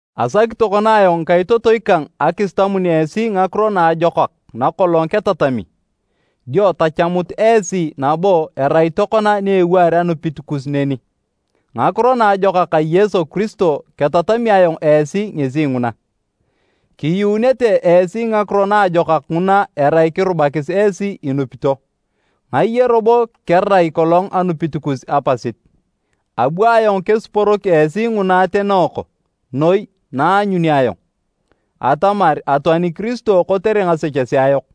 Asaki tokona ayong ngikaitotoi kang akisitamun esi Ngakiro Naajokak nakolong ketatami, dio tachamut esi nabo erai tokona ni ewaar anupit kus neni. Ngakiro Naajokak a Yesu Kiristo ketatami ayong esi ngesi nguna. Kiyuunete esi Ngakiro Naajokak nguna erai kirubakis esi inupito, ngaye robo kerai kolong anupit kus apasit. Abu ayong kesiporok esi nguna atenooko noi na aanyuni ayong, atamar atoani Kiristo kotere ngasechesea yok,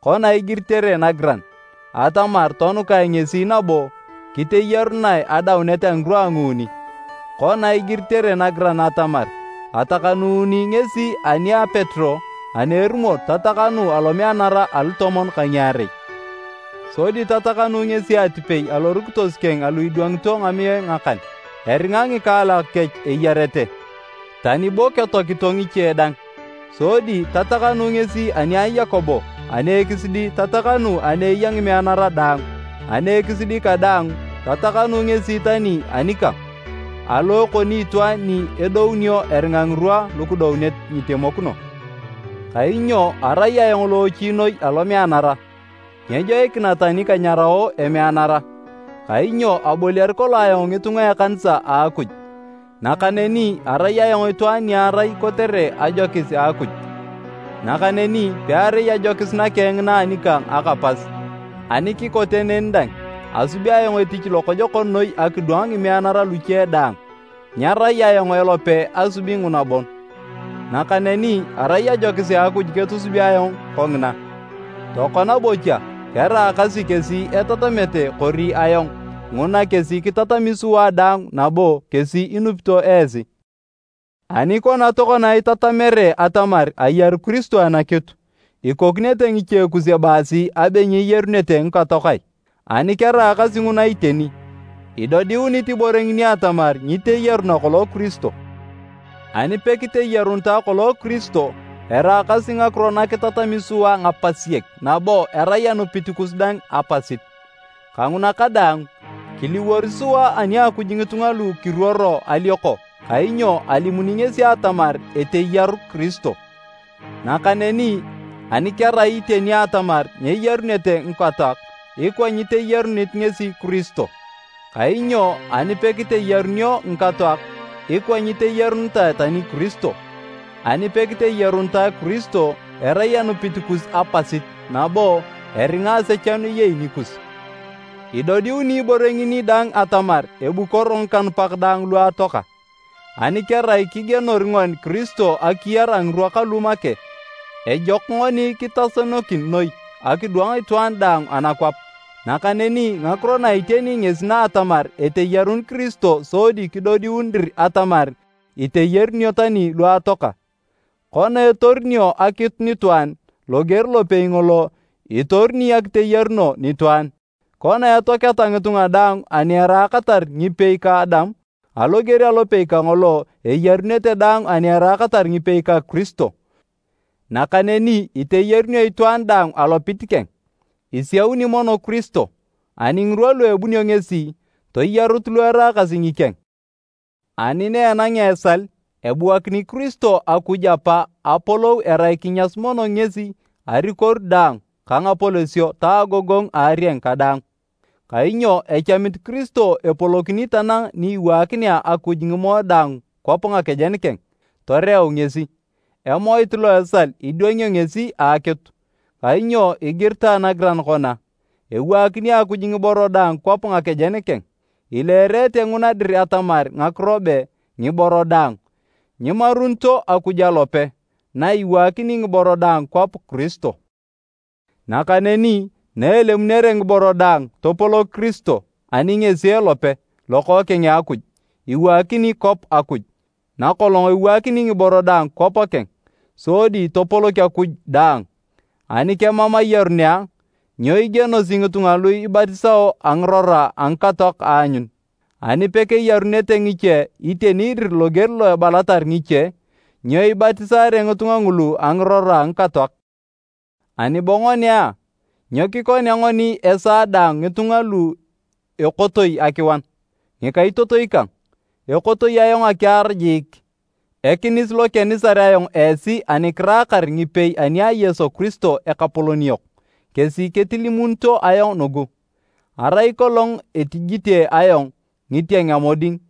kona igiritere nagiran, atamar tonukae ngesi nabo kiteyarunae adaunet a ngirwa a nguuni, kona igiritere nagiran atamar, atakanuuni ngesi ani a Petero ani erumor tatakanu alomeanara alutomon ka ngiarei. Sodi tatakanu ngesi atipei alorukitos keng alu idwangito ngamiae ngakan. Eringa ngikaalak kech eyarete, tani bo ketoakito ngiche dang. Sodi tatakanu ngesi ani a Yakobo ani ekisidi tatakanu ani eya ngimeanara daang. Ani ekisidi kadaang tatakanu ngesi tani anikang, alo ekoni itwaan ni edounio eringa ngirwa lukidounet nyitemokino. Kainyo arai ayong loochi noi alomeanara, nyejoikina tani kanyarao emeanara, kainyo aboliar kolong ayong ngitunga a ekanisa a Akuj. Nakaneni arai ayong itwaan ni arai kotere ajokis a Akuj, nakaneni pearai ajokis nakeng ngina anikang aka pas. Ani kikote neni dang, asub ayong etich lokojokon noi akidwang ngimeanara luche daang, nyerai ayong elope asubi nguna bon, nakaneni arai ajokis a Akuj ketusubi ayong kongina. Tokona bocha, keraakasi kesi etatamete kori ayong, nguna kesi kitatami sua daang nabo kesi inupito esi. Ani kona tokona itatamere atamar ayaru Kiristo anakitu, ikokinete ngiche kus ebaasi abe nyeyarunete ngikatoak ai? Ani keraakasi nguna iteni, idodiunit ibore ngini atamar nyiteyaruna kolong Kiristo. Ani pekiteyarunitae kolong Kiristo, eraakasi ngakiro na kitatami sua ngapasiek nabo erai anupit kus dang apasit. Kanguna kadaang, kiliwor sua ani a Akuj ngitunga lu kiruoro alioko kainyo alimuni ngesi atamar eteyaru Kiristo, nakaneni ani kerai iteni atamar nyeyarunete ngikatoak, ikwa nyiteyarunit ngesi Kiristo. Kainyo ani pekiteyarunio ngikatoak, ikwa nyiteyarunitae tani Kiristo. Ani pekiteyarunitae Kiristo, erai anupit kus apasit nabo eringa asechanu eyei nikus. Idodiuni ibore ngini dang atamar ebukoro ngikanupak daang lu atoaka. Ani kerai kigienor ngoni Kiristo akiyar a ngirwa kalu make, ejok ngoni kitasenokin noi akidwang itwaan daang anakwap. Nakaneni ngakiro na iteni ngesi na atamar eteyarun Kiristo sodi kidodiun dir atamar iteyarunio tani lu atoaka. Kona etorunio akitu nitwaan, loger lopei ngolo, itoruni akiteyaruno nitwaan. Kona etoaketa ngitunga daang ani eraakatar ngipei ka Adam, aloger alopei kangolo, eyarunete daang ani eraakatar ngipei ka Kiristo. Nakaneni iteyarunio itwaan daang alopit keng, isiauni mono Kiristo, ani ngirwa lu ebunio ngesi, toyarut lu eraakasi ngikeng. Ani na enangea esal, ebuakini Kiristo Akuj Apa apolou erai kinyasu mono ngesi arikoru daang ka ngapolosio ta agogongu a arieng kadaang. Kainyo echamit Kiristo epolokini tanang ni iwaakinea Akuj ngimoe daang kwap nakejen keng, toreu ngesi. Emoit lo esal idwangio ngesi akitu. Kainyo igiritae nagiran kona, “Ewaakini Akuj ngiboro daang kwap nakejen keng.” Ileerete nguna dir atamar ngakiro be “ngiboro daang” nyimarunito Akuj alope, na iwaakini ngiboro daang kwap Kiristo. Nakaneni na elemunere ngiboro daang topolok Kiristo, ani ngesi elope, Lokookeng a Akuj, iwaakin kwap Akuj, nakolong ewaakini ngiboro daang kwap keng, sodi topolok Akuj daang. Ani kemam ayarun a, nyo igienosi ngitunga lu ibatisao a ngirora a ngikatoak aanyun? Ani pekeyarunete ngiche iteni dir loger lo ebalatar ngiche, nyo ibatisaare ngitunga ngulu a ngirora a ngikatoak? Ani bo ngoni a, nyo kikonea ngoni esaa daang ngitunga lu ekotoi akiwan? Ngikaitotoi kang, ekotoi ayong akiar jiik! Ekinis lo kenisar ayong esi ani kiraakar ngipei ani a Yesu Kiristo Ekapolon yok, kesi ketilimunito ayong nugu. Arai kolong etijite ayong “Ngitieng a moding”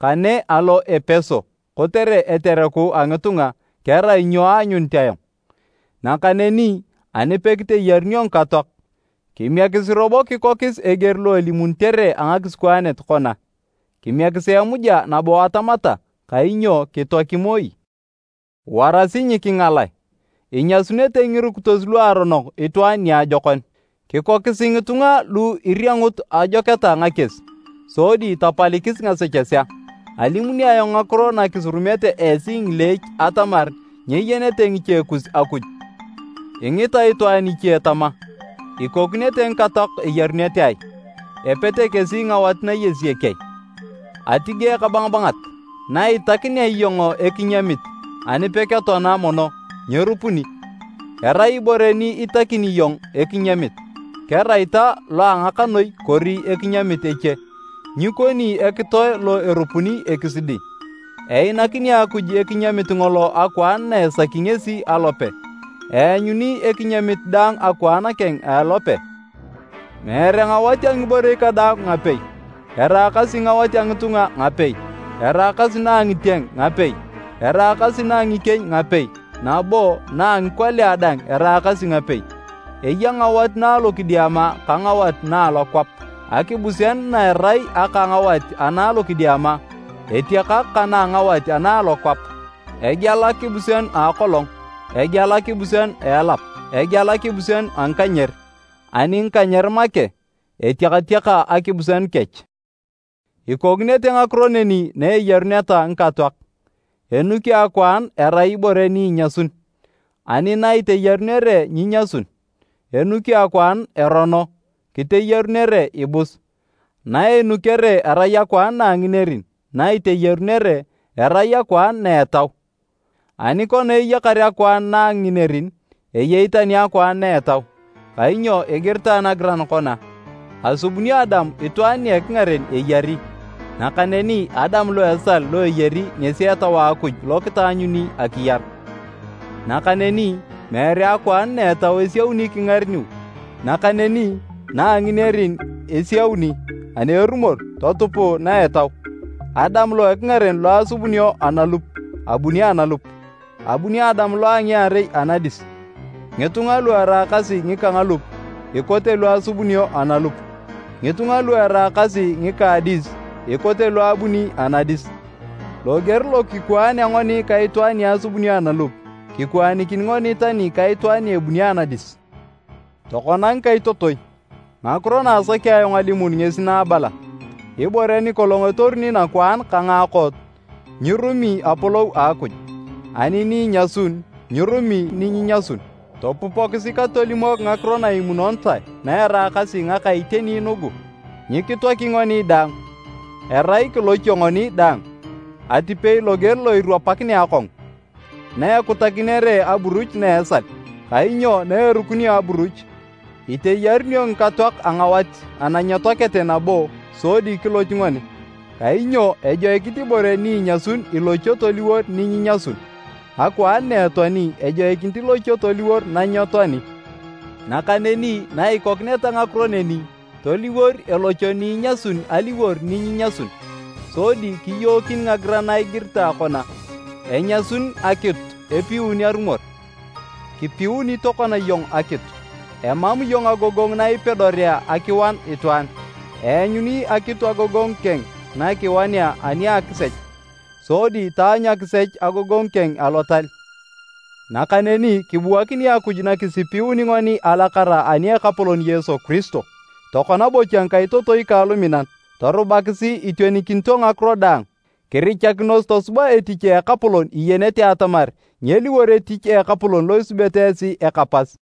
kane alo Epeso kotere etereku a ngitunga, kerai nyo aanyunit ayong? Nakaneni ani pekiteyarunio ngikatoak, kimiekisi robo kikokis eger lo elimunitere a ngakisikwaanet kona, “Kimiekisi emuja nabo atamata, kainyo kitoaki moi.” Warasi nyikingalae, “Inyasunete ngirukitos luaronok itwaan niajokon”. Kikokisi ngitunga lu iriangut ajoketa ngakies, sodi tapalikis ngasechesea. Alimuni ayong ngakiro na kisurumete esi ngileech atamar nyeyenete ngiche kus Akuj. Ingita itwaan iche tama, “Ikokinete ngikatoak eyarunete ai? Epete kesi ngawat nayesiyek ai?” Atige ekabangabangat! Naitakinea iyong ekinyamit, ani peketoana mono, nyerupuni. Erai ibore ni itakini iyong ekinyamit, kerai ta lo a ngakanoi kori ekinyamit eche, nyikoni ekitoe lo erupuni ekisidi. Einakini Akuj ekinyamit ngolo akwaan na esaki ngesi alope, eanyuni ekinyamit daang akwaan keng a elope. Meere ngawat a ngiborei kadaang ngapei. Eraakasi ngawat a ngitunga ngapei, eraakasi na a ngitieng ngapei, eraakasi na a ngikieny ngapei nabo na a ngikolia dang eraakasi ngapei. Eya ngawat na alokidiama ka ngawat na alokwap. Akibuseanu na erai aka ngawat ana alokidiama, etiakak ka na a angawat ana a alokwap. Egeal akibuseanu a akolong, egeal akibuseanu a elap, egeal akibuseanu a ngikanyer, ani ngikanyer make, etiakatiaka akibuseanu kech. Ikokinete ngakiro neni na eyaruneta ngikatoak. Enukio akwaan erai ibore ni inyasun, ani na iteyarunere nyinyasun. Enukio akwaan erono, kiteyarunae ibus. Na enukere erai akwaan na a nginerin, na iteyarunere, erai akwaan na a etau. Ani kona eyakar akwaan na a nginerin, eyei tani akwaan na a etau. Kainyo igiritae nagiran kona, “Asubunio Adam itwaan nia ekingaren eyari”, nakaneni Adam lo esal lo eyari ngesi Etau a Akuj lo kitaanyuni akiyar. Nakaneni meere akwaan na a etau isiauni kingareniu, nakaneni na a nginerin isiauni ani erumor totupuu na a etau. Adam lo ekingaren lo asubunio analup, abuni analup. Abuni Adam lo a ngiarei anadis. Ngitunga lu eraakasi ngika ngalup, ikote lo asubunio analup. Ngitunga lu eraakasi ngika a adis ikote lo abuni anadis. Loger lo kikwaanea ngoni ka itwaan ni asubunio analup, kikwaanikin ngoni tani ka Itwaan ni ebuni anadis. Tokona ngikaitotoi, ngakiro na asaki ayong alimun ngesi na abala, ibore nikolong etoruni nakwaan ka ngaakot, nyirumi Apolou a Akuj, ani ni inyasun, nyirumi ni nyinyasun. Topupokisi katolimok ngakiro na imunonitae na eraakasi ngaka iteni nugu, nyikitoaki ngoni daang, erai kilochio ngoni daang atipei loger lo irwapakinea akongu, na ekutakinere aburuch na a esal. Kainyo na erukinio aburuch, iteyarunio ngikatoak a ngawat ana nyetoakete nabo sodi kiloch ngoni. Kainyo ejoikinit ibore ni inyasun ilochio toliwor ni nyinyasun, akwaan na etoani, ejoikinit ilochio toliwor na nyetoani. Nakaneni na ikokineta ngakiro neni, toliwor elocho ni inyasun aliwor ni nyinyasun, sodi kiyookin ngagiran na igiritae kona, “Enyasun akitu epiun arumor!” “Kipiun tokona iyong akitu. Emam iyong agogongu na ipedorea akiwan itwaan.” Eanyuni akitu agogongu keng na kiwanea ani a akisech, sodi taanyu akisech agogongu keng alotal. Nakaneni kibuakini Akuj na kisipiuni ngoni alakara ani a Ekapolon Yesu Kiristo! Tokona bocha ngikaitotoi kang luminan, torubakisi itionikinito ngakiro daang. Kirichakinos tosuba etich a Ekapolon iyenete atamar nyeliwor etich a Ekapolon lo isubete esi eka pas.